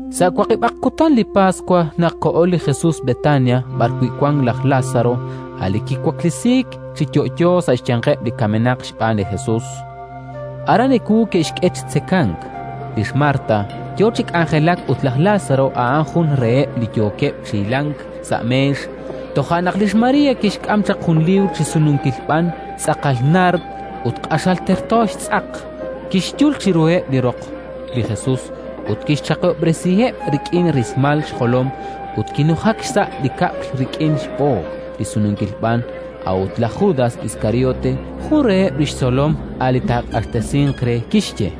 Sa' waqib'aq kutan li Paswa naq koho li Jesus Betania b'arwi' wank laj Lázaro, a' li kiwaklesiik chi yo'yo sa' xyanqeb' li kamenaq xb'aan li Jesus. Aran ewu ke'xk'e chi tzekank; lix Marta yo chi k'anjelak ut laj Lázaro a'an jun reheb' li yookeb' chi hilank sa' meex. Toja' naq lix María kixk'am chaq jun liib'r chi sununkil b'an, tz'aqal naard ut q'axal terto xtz'aq; kixyul chiruheb' li roq li Jesus ut kixchaqihob'resiheb' rik'in rismal xjolom. Ut kinujak xsa' li kab'l rik'in xb'ook li sununkil b'an. A'ut laj Judas Iskariote, jun reheb' li xtzolom, a' li taaq'axtesinq re, kixye: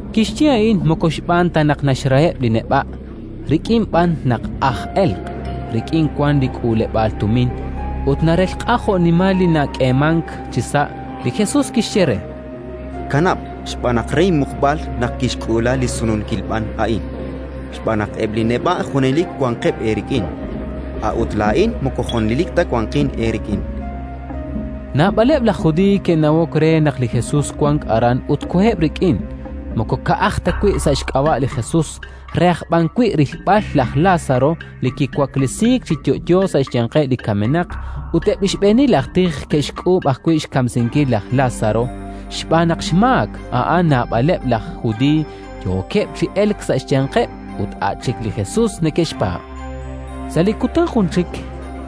Kixye a'in moko xb'aan ta naq naxraheb' li neb'a', rik'in b'an naq aj elq': rik'in wank li k'uuleb'aal tumin, ut narelq'a jo'nimal li nak'eemank chisa'. Li Jesus kixye re: —Kanab', xb'aan naq re inmuqb'al naq kixk'uula li sununkil b'an a'in. Xb'aan naq eb' li neb'a' junelik wanqeb' eerik'in, a'ut laa'in moko junelik ta wanqin eerik'in. Naab'aleb' laj Judiiy ke'nawok re naq li Jesus wank aran ut koheb' rik'in, moko ka'aj ta wi' sa' xk'ab'a' li Jesus, re aj b'an wi' rilb'al laj Lázaro li kiwaklesiik chi yo'yo sa' xyanqeb' li kamenaq. Ut eb' li xb'eenil aj tij ke'xk'uub' ajwi' xkamsinkil laj Lázaro, xb'aan naq xmaak a'an naab'aleb' laj Judiiy yookeb' chi elk sa' xyanqeb' ut a' chik li Jesus neke'xpaab'. Sa' li kutan jun chik,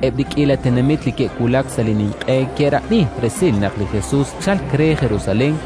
eb' li k'iila tenamit li ke'wulak sa' li Ninq'e A'an li Paswa. ke'rab'i resil naq li Jesus chalk re Jerusalén;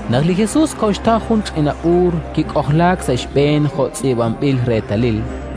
Naq li Jesus koxtaw jun ch'ina b'uur, kik'ojlaak sa' xb'een jo' tz'iib'anb'il reetalil: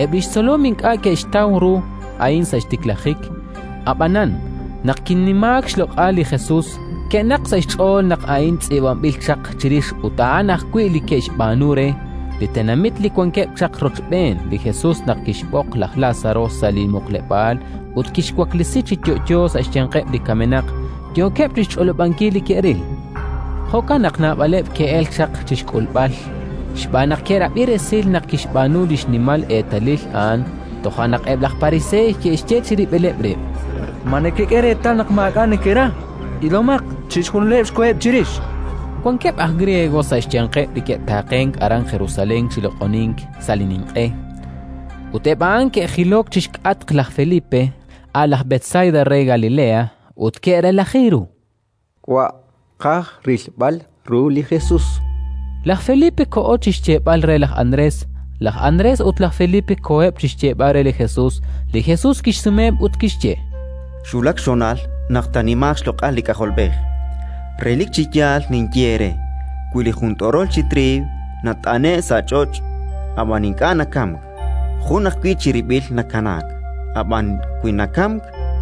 Eb' li xtzolom ink'a' ke'xtaw ru a'in sa' xtiklajik; ab'anan, naq kinimaak xloq'al li Jesus, ke'naqk sa' xch'ool naq a'in tz'iib'anb'il chaq chirix ut a'an ajwi' li ke'xb'aanu re. Li tenamit li wankeb' chaq rochb'een li Jesus naq kixb'oq laj Lázaro sa' li muqleb'aal ut kixwaklesi chi yo'yo sa' xyanqeb' li kamenaq, yookeb' chi xch'olob'ankil li ke'ril. Jo'kan naq naab'aleb' ke'elk chaq chi xk'ulb'al, xb'aan naq ke'rab'i resil naq kixb'aanu li xnimal eetalil a'an. Toja' naq eb' laj Pariseey ke'xye chirib'ileb' rib': —Ma nekek'e reetal naq maak'a' nekera? Ilomaq, chixjunileb' xkoheb' chirix. Wankeb' aj griego sa' xyanqeb' li ke'taqe'k aran Jerusalén chi loq'onink sa' li Ninq'e. Ut eb' a'in ke'jilok chi xk'atq laj Felipe, a' laj Betsaida re Galilea, ut ke'relaji ru: —Wa', tqaj rilb'al ru li Jesus, chankeb'. Laj Felipe koho chi xyeeb'al re laj Andrés; laj Andrés ut laj Felipe koheb' chi xyeeb'al re li Jesus. Li Jesus kixsumeheb' ut kixye: —Xwulak xhonal naq taanimaaq xloq'al li K'ajolb'ej. Relik chi yaal ninye eere: wi li jun t'orol chi triiw nat'ane'k sa' ch'och', ab'an ink'a' nakamk, jun ajwi' chirib'il nakanaak; ab'anan, wi nakamk,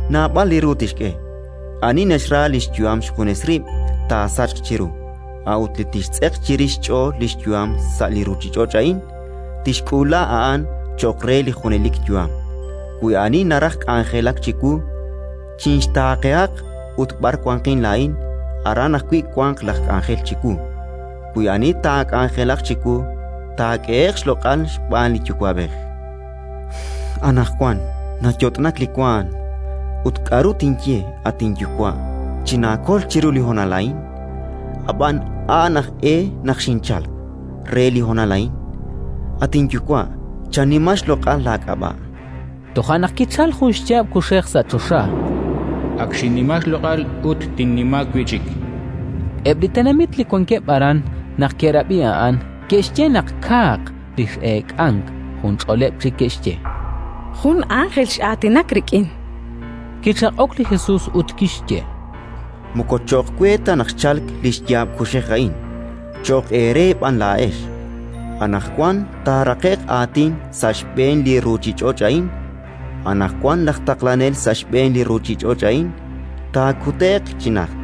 naab'al li ru tixk'e. Ani naxra li xyu'am xjunes rib', taasachq chiru; a'ut li tixtz'eq chirix xch'ool li xyu'am sa' li ruuchich'och' a'in, tixk'uula a'an cho'q re li junelik yu'am. Wi ani naraj k'anjelak chiwu, chinxtaaqehaq, ut b'ar wanqin laa'in, aran ajwi' wanq laj k'anjel chiwu. Wi ani taak'anjelaq chiwu, taak'ehe'q xloq'al xb'aan li Yuwa'b'ej. “Anaqwan nayot'nak li waanm. Ut k'aru tinye: «At inYuwa', chinaakol chiru li honal a'in»? Ab'an a'an aj e naq xinchalk: re li honal a'in! At inYuwa', chanima xloq'al laak'ab'a'”. Toja' naq kichalk jun xyaab' kuxej sa' choxa: “Ak xinnima xloq'al ut tinnima wi' chik”, chan. Eb' li tenamit li wankeb' aran, naq ke'rab'i a'an, ke'xye naq kaaq li x'eek'ank. Junch'oleb' chik ke'xye: “Jun ánjel x'aatinak rik'in”. Kichaq'ok li Jesus ut kixye: —Moko cho'q we ta naq xchalk li xyaab' kuxej a'in, cho'q eere b'an laa'ex. Anaqwan taaraqe'q aatin sa' xb'een li ruuchich'och' a'in. Anaqwan laj Taqlanel sa' xb'een li ruuchich'och' a'in taakute'q chi najt.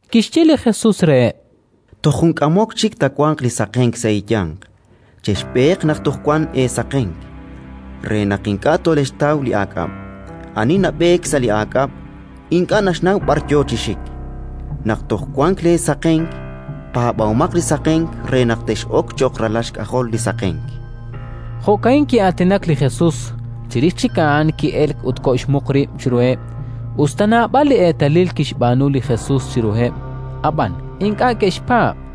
Kixye li Jesus reheb': —Toj jun k'amok chik taawanq li saqenk sa' eeyanq. Chexb'eeq naq toj wanq eesaqenk, re naq ink'a' tolexxtaw li aak'ab': ani nab'eek sa' li aak'ab', ink'a' naxnaw b'ar yo chi xik. Naq toj wank leesaqenk, paab'omaq li saqenk re naq tex'ok cho'q ralal xk'ajol li saqenk. Jo'ka'in ki'aatinak li Jesus; chirix chik a'an ki'elk ut koxmuq rib' chiruheb'. Us ta naab'al li eetalil kixb'aanu li Jesus chiruheb', ab'an ink'a' ke'xpaab',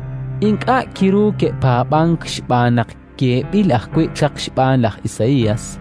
Ink'a' kiru ke'paab'ank xb'aan naq yeeb'il ajwi' chaq xb'aan laj Isaías: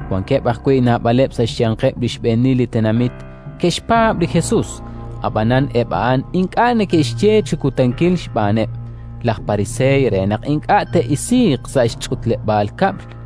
Wankeb' ajwi' naab'aleb' sa' xyanqeb' li xb'eenil li tenamit ke'xpaab' li Jesus; ab'anan eb' a'an ink'a' neke'xye chi kutankil xb'aaneb' laj Pariseey re naq ink'a' te'isiiq sa' li ch'utleb'aal kab'l: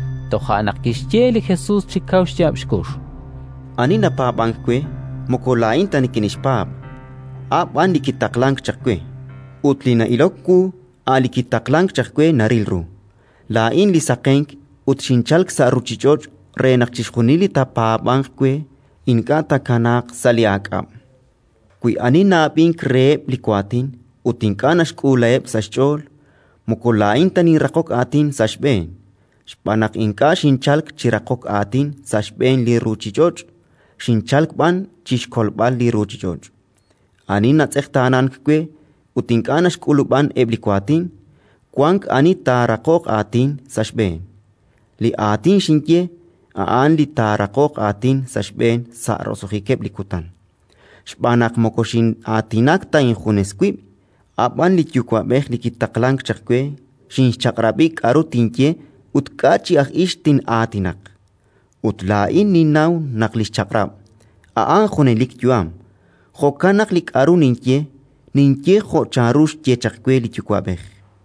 Toja' naq kixye li Jesus chi kaw xyaab' xkux: —Ani napaab'ank we, moko laa'in ta nikinxpaab', a' b'an li kitaqlank chaq we; ut li na'ilok wu, a' li kitaqlank chaq we naril ru. Laa'in li saqenk ut xinchalk sa' ruuchich'och' re naq chixjunil li taapaab'anq we, ink'a' tkanaaq sa' li aak'ab'. Wi ani na'ab'ink reheb' li waatin ut ink'a' naxk'uulaheb' sa' xch'ool, moko laa'in ta ninraqok aatin sa' xb'een: xb'aan naq ink'a' xinchalk chi raqok aatin sa' xb'een li ruuchich'och', xinchalk b'an chi xkolb'al li ruuchich'och'. Ani natz'eqtaanank we ut ink'a' naxk'ulub'an eb' li waatin, wank ani taaraqoq aatin sa' xb'een: li Aatin xinye, a'an li taaraqoq aatin sa' xb'een sa' roso'jikeb' li kutan. “Xb'aan naq moko xin'aatinak ta injunes wib', a' b'an li Yuwa'b'ej li kitaqlank chaq we xinxchaq'rab'i k'aru tinye ut k'a' chi aj ix tin'aatinaq; ut laa'in ninnaw naq li xchaq'rab', a'an junelik yu'am. Jo'kan naq li k'aru ninye, ninye jo' chanru xye chaq we li Yuwa'b'ej”.